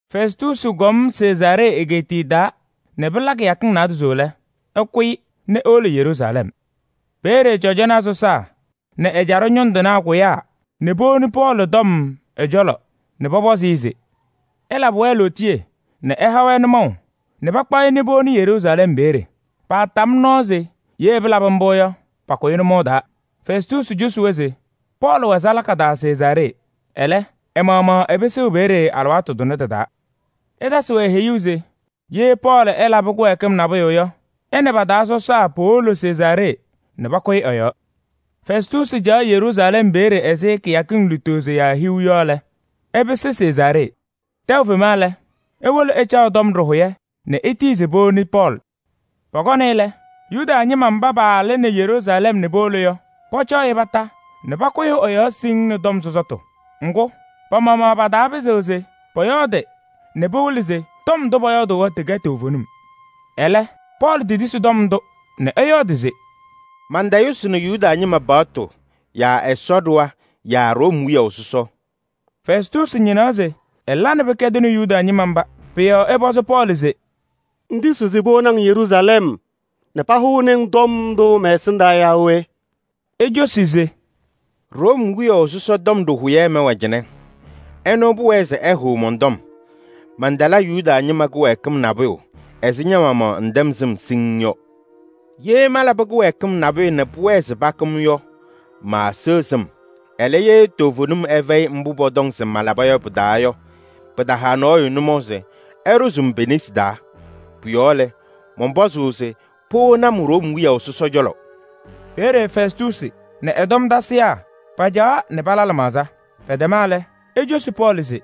Fɛstuusi kɔm Sezaaree egeetiye taa nɛ pɩla kɩyakɩŋ naadozo lɛ, ɛkʋyɩ nɛ ewolo Yeruusalɛm. Peeye cɔjɔnaa sɔsaa nɛ ɛjaɖɛ ñʋŋ tɩnaa pakʋyaa nɛ powoni Pɔɔlɩ tɔm ɛ-cɔlɔ nɛ pɔpɔzɩ-ɩ se ɛlabɩ-wɛ lootiye nɛ ɛha-wɛ nʋmɔʋ nɛ pakpaɣ-ɩ nɛ powoni Yeruusalɛm peeye. Paatam nɔɔ se ye pɩlabɩ mbʋ yɔ, pakʋ-ɩ nʋmɔʋ taa. Fɛstuusi cosi-wɛ se Pɔɔlɩ wɛ salaka taa Sezaaree. Ɛlɛ, ɛ-maɣmaɣ ɛpɩsɩɣ peeye alɩwaatʋ tʋnɛ tɩ-taa. Ɛtasɩ-wɛ heyuu se ye Pɔɔlɩ ɛlabɩ kɩwɛɛkɩm nabʋyʋ yɔ, ɛ nɛ pa-taa sɔsaa powolo Sezaaree nɛ pakʋyɩ ɛ-yɔɔ. Fɛstuusi caɣ Yeruusalɛm peeye ɛzɩ kɩyakɩŋ lutozo yaa hiu yɔ lɛ, ɛpɩsɩ Sezaaree. Tɛʋ fema lɛ, ewolo ɛcaɣ tɔm ɖɩhʋyɛ nɛ etiyi se powoni Pɔɔlɩ. Pɔkɔnɩ-ɩ lɛ, Yuda ñɩma mba paalɩnɩ Yeruusalɛm nɛ powolo yɔ, pɔcɔɔ-ɩ kondiko nɛ pakʋyɩ ɛ-yɔɔ siŋŋ nɛ tɔm sɔsɔtʋ. Ŋgʋ, pa-maɣmaɣ pataapɩzɩɣ se pɔyɔɔdɩ nɛ pawɩlɩ se ndʋ pɔyɔɔdʋʋ yɔ tɩkɛ toovenim. Ɛlɛ Pɔɔlɩ tetisi tɔm ndʋ nɛ ɛyɔɔdɩ se: “Mantayʋsɩnɩ Yuda ñɩma paɣtʋ yaa Ɛsɔ ɖɩɣa yaa Room wiyaʋ sɔsɔ.” Fɛstuusi ñɩnaɣ se ɛla nɛ pɩkɛdɩnɩ Yuda ñɩma mba. Pʋ-yɔɔ ɛpɔzɩ Pɔɔlɩ se: “Ŋtisiɣ se powoni-ŋ Yeruusalɛm nɛ pahʋnɩ-ŋ tɔm ndʋ mɔn-cɔlɔ yaa we?” Ecosi se: “Room wiyaʋ sɔsɔ tɔm ɖɩhʋyɛ mɛwɛ cɩnɛ. Ɛnʋ pʋwɛɛ se ɛhʋʋ mɔn-tɔm. Mantala Yuda ñɩma kɩwɛɛkɩm nabʋyʋ ɛzɩ ña-maɣmaɣ ŋtɛm sɩm siŋŋ yɔ. Ye malabɩ kɩwɛɛkɩm nabʋyʋ nɛ pʋwɛɛ se pakʋ-m yɔ, maaseɣ sɩm. Ɛlɛ, ye toovenim ɛfɛyɩ mbʋ pɔtɔŋ se malaba yɔ pɩ-taa yɔ, pɩtaha nɔɔyʋ nʋmɔʋ se ɛɖʋzɩ-m pe-nesi taa. Pʋ-yɔɔ lɛ, mɔnpɔzʋʋ se powoni-m Room wiyaʋ sɔsɔ cɔlɔ.” Peeye Fɛstuusi nɛ ɛ-tɔm tasɩyaa pacaɣaɣ nɛ pala lɩmaɣza. Pɛtɛma lɛ, ecosi Pɔɔlɩ se: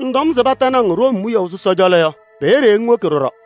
“Ŋtɔm se patanɩ-ŋ Room wiyaʋ sɔsɔ cɔlɔ yɔ, peeye ŋwoki ɖɔɖɔ.”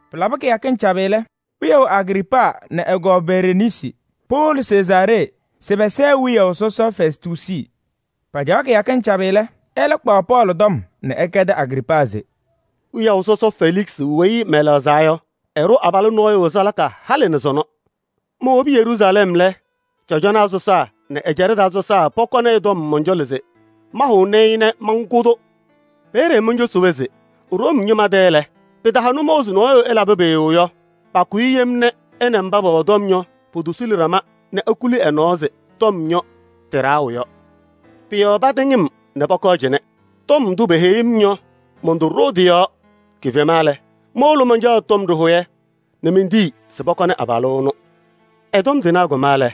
Pɩlabɩ kɩyakɩŋ cabɩ lɛ, wiyaʋ Agriipaa nɛ ɛ-kɔɔ Bereniisi powolo Sezaaree se pɛsɛɛ wiyaʋ sɔsɔ Fɛstuusi. Pacaɣ kɩyakɩŋ cabɩ lɛ, ɛlɛ kpaɣ Pɔɔlɩ tɔm nɛ ɛkɛdɩ Agriipaa se: “Wiyaʋ sɔsɔ Feliksɩ weyi mɛlɛɣzaa yɔ, ɛɖʋ abalʋ nɔɔyʋ salaka halɩ nɛ sɔnɔ. Mowobi Yeruusalɛm lɛ, cɔjɔnaa sɔsaa nɛ ɛjaɖɛ taa sɔsaa pɔkɔnɩ ɛ-tɔm mɔn-cɔlɔ se mahʋnɩ-ɩ nɛ mankʋ-tʋ. Peeye moncosi-wɛ se Room ñɩma tɛ lɛ, pɩtaha nʋmɔʋ se nɔɔyʋ ɛlabɩ pʋyʋ yɔ, pakʋ-ɩ yem nɛ ɛ nɛ mba pɛwɛ tɔm yɔ potosuli ɖama nɛ ekuli ɛ-nɔɔ se tɔm yɔ, tɩ-ɖaɣʋ yɔ. Pʋ-yɔɔ patɩŋ-m nɛ pɔkɔɔ cɩnɛ. Tɔm ndʋ peheyi-m yɔ, montoɖoo tɩ-yɔɔ: kifema lɛ, mowolo mancaɣ tɔm ɖɩhʋyɛ nɛ mentiyi se pɔkɔnɩ abalʋ ɛnʋ. Ɛ-tɔm tɩnaa kɔma lɛ,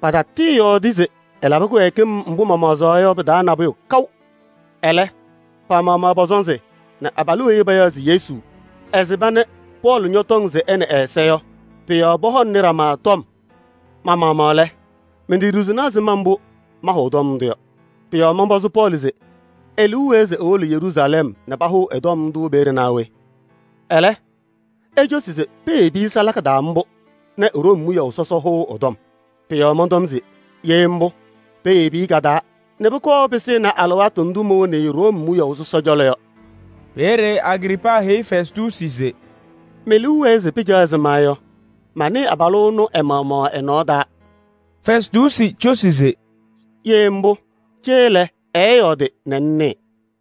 patatɩɩyɔɔdɩ se ɛlabɩ kɩwɛɛkɩm mbʋ mamaɣzaɣ yɔ pɩ-taa nabʋyʋ kaʋ. Ɛlɛ, pa-maɣmaɣ pɔ-sɔnzɩ nɛ abalʋ weyi payaɣ se Yesu, ɛsɩba nɛ Pɔɔlɩ ñɔtɔŋ se ɛ nɛ ɛ-ɛza yɔ, pʋ-yɔɔ pɔhɔŋaɣnɩ ɖama tɔm. Ma-maɣmaɣ lɛ, menteɖiɣzini ɛzɩma mbʋ maahʋʋ tɔm ndʋ yɔ. Pʋ-yɔɔ mɔnpɔzɩ Pɔɔlɩ se e-liu wɛɛ se ewolo Yeruusalɛm nɛ pahʋʋ ɛ-tɔm ndʋ peeye naa we? Ɛlɛ, ecosi se peyebi-i salaka taa mbʋ nɛ Room wiyaʋ sɔsɔ hʋʋ ɛ-tɔm. Pʋ-yɔɔ mɔntɔm se: ye mbʋ, peyebi-i ka-taa nɛ pʋkɔɔ pɩsɩnɩ alɩwaatʋ ndʋ mowoni-i Room wiyaʋ sɔsɔ cɔlɔ yɔ.” Peeye Agriipaa heyi Fɛstuusi se: “Me-liu wɛɛ se pɩcaɣ ɛzɩma yɔ, manɩɩ abalʋ ɛnʋ ɛ-maɣmaɣ ɛ-nɔɔ taa.” Fɛstuusi cosi se: “Ye mbʋ, cee lɛ ɛɛyɔɔdɩ nɛ ŋnɩɩ.”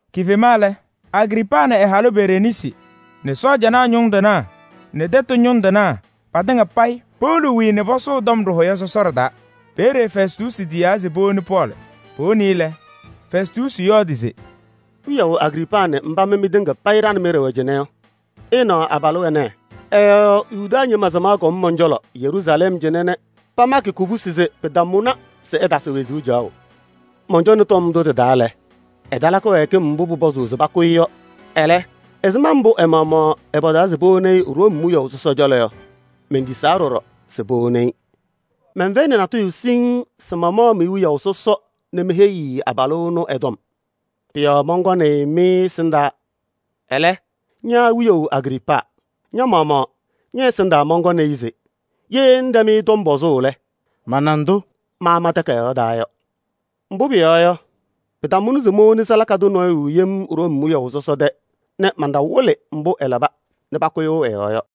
Kifema lɛ, Agriipaa nɛ ɛ-halʋ Bereniisi nɛ sɔɔjanaa ñʋŋ tɩnaa nɛ tɛtʋ ñʋŋ tɩnaa patɩŋa payɩ powolo wiii nɛ pasʋʋ tɔm ɖɩhʋyɛ sɔsɔɖɛ taa. Peeye Fɛstuusi tiyaa se powoni Pɔɔlɩ. Powonɩ-ɩ lɛ, Fɛstuusi yɔɔdɩ se: “Wiyaʋ Agriipaa nɛ mba mɩ mɩtɩŋa payɩ ɖa nɛ mɩ ɖɩwɛ cɩnɛ yɔ, ɩnaɣ abalʋ ɛnɛ, ɛ-yɔɔ Yuda ñɩma samaɣ kɔm mɔn-cɔlɔ Yeruusalɛm cɩnɛ nɛ pamakɩ kubusi se pɩtamʋnɩ se ɛtasɩ wezuu caɣʋ. Mɔncɔnɩ tɔm ndʋ tɩ-taa lɛ, ɛtala kɩwɛɛkɩm mbʋ pʋpɔzʋʋ se pakʋ-ɩ yɔ. Ɛlɛ, ɛzɩma mbʋ ɛ-maɣmaɣ ɛpɔzaa se powoni-i Room wiyaʋ sɔsɔ cɔlɔ yɔ, mentisaa ɖɔɖɔ se powoni-i. Mɛnfɛyɩnɩ natʋyʋ siŋŋ se mamaɣ me-wiyaʋ sɔsɔ nɛ meheyi-i abalʋ ɛnʋ ɛ-tɔm. Pʋ-yɔɔ mɔnkɔnɩ-ɩ mɩ-ɛsɩndaa. Ɛlɛ, ña wiyaʋ Agriipaa, ña-maɣmaɣ ñɛ- ɛsɩndaa mɔnkɔnɩ-ɩ se ye ŋtɛm-ɩ tɔm pɔzʋʋ lɛ, mana ndʋ maama takayaɣ taa yɔ. Mbʋ pʋyɔɔ yɔ, pɩtamʋnɩ se mowoni salaka tʋ nɔɔyʋ yem Room wiyaʋ sɔsɔ tɛ nɛ mantawɩlɩ mbʋ ɛlaba nɛ pakʋyʋʋ ɛ-yɔɔ yɔ.”